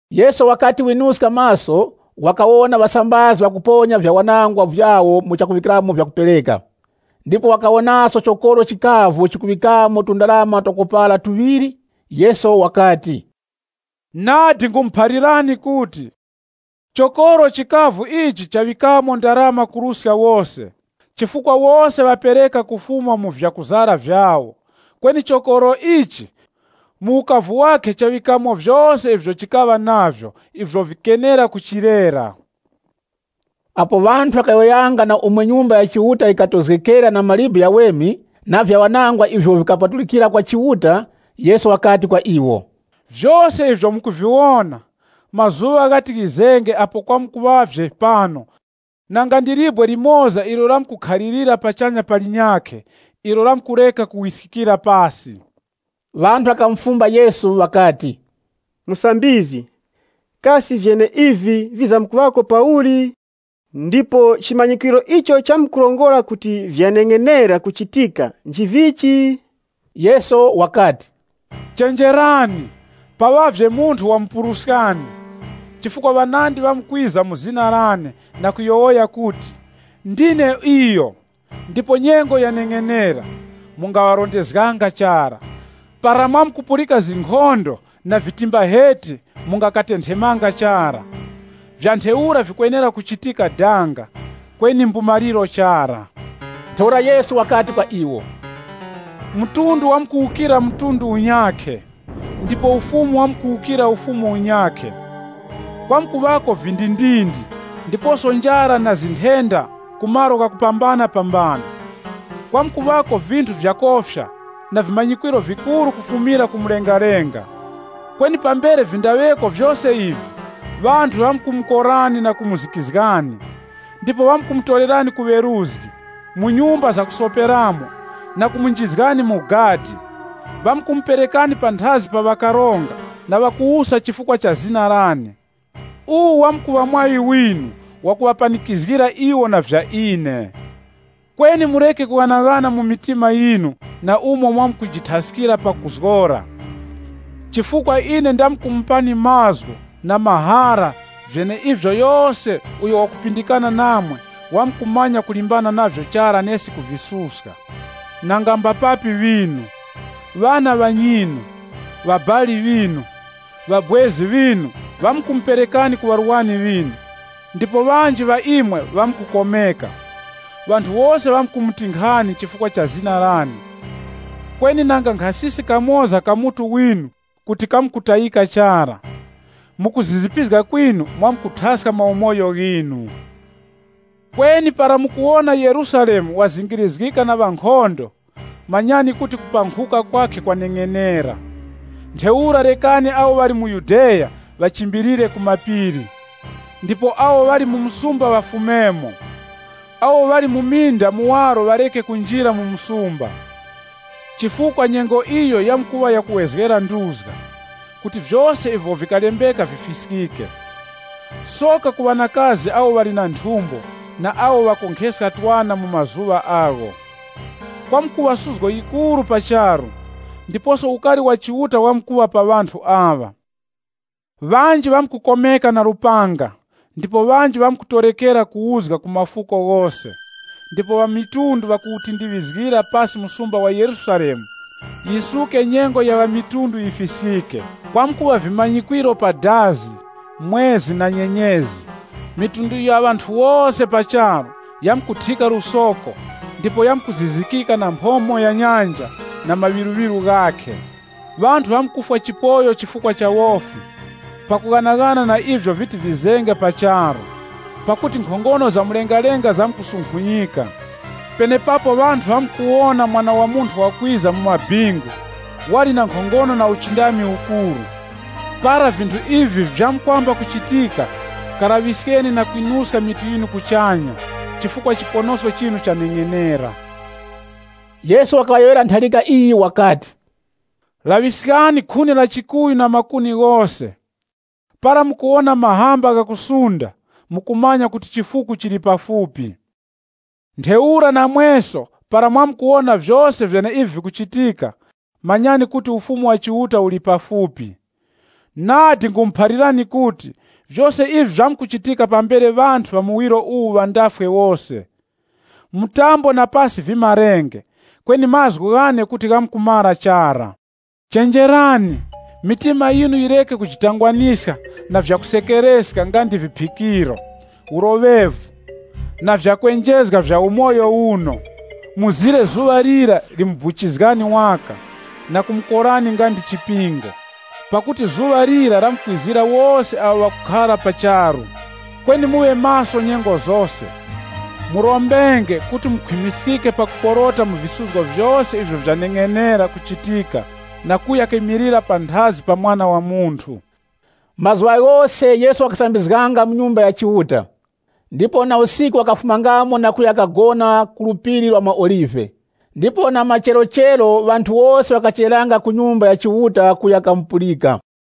Yesu wakati winuska maso, wakawona ŵasambazi ŵakuponya vyawanangwa vyawo mu chakuŵikamo vyakupereka. Ndipo wakawonaso chokoro chikavu chikuŵikamo tundarama tuŵiri. Yesu wakati, “Nadi nkhumuphalirani kuti, chokoro chikavu ichi chaŵikamo ndarama kuruska wose, Chifukwa wose ŵapereka kufuma mu vyakuzara vyawo, kweni chokoro ichi, mu ukavu wakhe chaŵikamo vyose ivyo chikaŵa navyo ivyo vikenera kuchilera.” Apo ŵanthu ŵakayowoyanga na umo Nyumba ya Chiuta yikatozgekera na mawe ghaweme na vyawanangwa ivyo vikapatulikira kwa Chiuta, Yesu wakati kwa iwo, “Vyose ivyo mukuviwona, mazuŵa ghati ghizenge apo kwamkuŵavye pano nanga ndi libwe limoza ilo lamkukhalirira pachanya pa linyakhe ilo lamkureka kuwiskikira pasi.” Ŵanthu ŵakamufumba Yesu ŵakati, “Musambizgi, kasi vyeneivi vizamkuŵako pauli? Ndipo chimanyikwiro icho chamkurongora kuti vyaneng'enera kuchitika nchivichi?” Yesu wakati, “Chenjerani, paŵavye munthu wamupuruskani. Chifukwa ŵanandi ŵamkwiza mu zina lane na kuyowoya kuti, ‘Ndine iyo,’ ndipo ‘Nyengo yaneng'enera.’ Mungaŵarondezganga chara. Para mwamkupulika zinkhondo na vitimbaheti mungakatenthemanga chara. Vya ntheura vikwenera kuchitika danga, kweni mbumaliro chara.” Ntheura Yesu wakati kwa iwo, Mtundu wamkuwukira mtundu unyakhe, ndipo ufumu wamkuwukira ufumu unyakhe. Kwamkuŵako vindindindi vyakofya, ndiposo njara na nthenda mu malo ghakupambanapambana. Kwamkuŵako vinthu vyakofya na vimanyikwiro vikuru kufumira ku mlengalenga. “Kweni pambere vindaŵeko vyose ivi, ŵanthu ŵamkumukorani na kumuzikizgani. Ndipo ŵamkumutorerani ku weruzgi, mu nyumba zakusoperamo, na kumunjizgani mu gadi. Ŵamkumuperekani panthazi pa ŵakaronga na ŵakuwusa chifukwa cha zina lane. Uwu wamkuŵa mwaŵi winu wakuŵapanikizgira iwo na vya ine. Kweni mureke kughanaghana mu mitima yinu na umo mwamkujithaskira pakuzgora. Chifukwa ine ndamkumupani mazgu na mahara vyeneivyo yose uyo wakupindikana namwe wamkumanya kulimbana navyo chara nesi kuvisuska. Nanga mbapapi ŵinu, ŵana ŵanyinu, ŵabali ŵinu, ŵabwezi ŵinu ŵamkumuperekani ku ŵarwani ŵinu, ndipo ŵanji ŵa imwe ŵamkukomeka. Ŵanthu wose ŵamkumutinkhani chifukwa cha zina lane. Kweni nanga nkhasisi kamoza ka mutu winu kuti kamkutayika chara. Mu kuzizipizga kwinu mwamkuthaska maumoyo ghinu.” “Kweni para mukuwona Yerusalemu wazingirizgika na ŵankhondo, manyani kuti kupankhuka kwakhe kwaneng'enera. Ntheura rekani awo ŵali mu Yudeya ŵachimbilire ku mapiri. Ndipo awo ŵali mu msumba ŵafumemo. Awo ŵali mu minda muwaro ŵareke kunjira mu msumba. Chifukwa nyengo iyo yamkuŵa yakuwezgera nduzga, kuti vyose ivyo vikalembeka vifiskike. Soka ku ŵanakazi awo ŵali na nthumbo na awo ŵakonkheska twana mu mazuŵa agho. Kwamkuŵa suzgo yikuru pa charu, ndiposo ukari wa Chiuta wamkuŵa pa ŵanthu aŵa. Ŵanji ŵamkukomeka na lupanga, ndipo ŵanji ŵamkutorekera mu uzga ku mafuko ghose. Ndipo ŵamitundu ŵamkuwuponderezga msumba wa Yerusalemu, yisuke nyengo ya ŵamitundu yifiskike.” “Kwamkuŵa vimanyikwiro pa dazi, mwezi na nyenyezi. Mafuko ghose pa charu, yamkuthika lusoko ndipo yamkuzizikika na mphomo ya nyanja na maŵiruŵiru ghakhe. Ŵanthu ŵamkufwa chipoyo chifukwa cha wofi, pakughanaghana na ivyo viti vizenge pa charu. Pakuti nkhongono za mlengalenga zamkusunkhunyika. Penepapo ŵanthu ŵamkuwona Mwana wa Munthu wakwiza mu maŵingu wali na nkhongono na uchindami ukuru. Para vinthu ivi vyamkwamba kuchitika, kalaŵiskeni na kwinuska mitu yinu kuchanya, chifukwa chiponosko chinu chaneng'enera.” Yesu wakaŵayowoyera ntharika iyi wakati, “Laŵiskani khuni la chikuyu na makuni ghose. Para mukuwona mahamba ghakusunda, mukumanya kuti chifuku chili pafupi. Ntheura namweso, para mwamkuwona vyose vyeneivi vikuchitika, manyani kuti Ufumu wa Chiuta uli pafupi. “Nadi nkhumuphalirani kuti, vyose ivi vyamkuchitika pambere ŵanthu ŵa muwiro uwu ŵandafwe wose. Mtambo na pasi vimarenge, kweni mazgu ghane kuti ghamkumara chara. “Chenjerani, mitima yinu yireke kujitangwaniska na vyakusekereska nga ndi viphikiro, uloŵevu na vyakwenjezga vya umoyo uno, mzire zuŵa lira limubuchizgani waka na kumukorani nga ndi chipingo. Pakuti zuŵa lira lamkwizira wose awo ŵakukhara pa charu. Kweni muŵe maso nyengo zose, murombenge kuti mukhwimiskike pakuporota mu visuzgo vyose ivyo vyaneng'enera kuchitika na kuya kimilira panthazi pa Mwana wa Munthu.” Mazuŵa ghose Yesu wakasambizganga mu Nyumba ya Chiuta. Ndipo na usiku wakafumangamo na kuya kagona ku Phiri la maOlive. Ndipo na macherochero ŵanthu wose ŵakachereranga ku Nyumba ya Chiuta kuya kamupulika.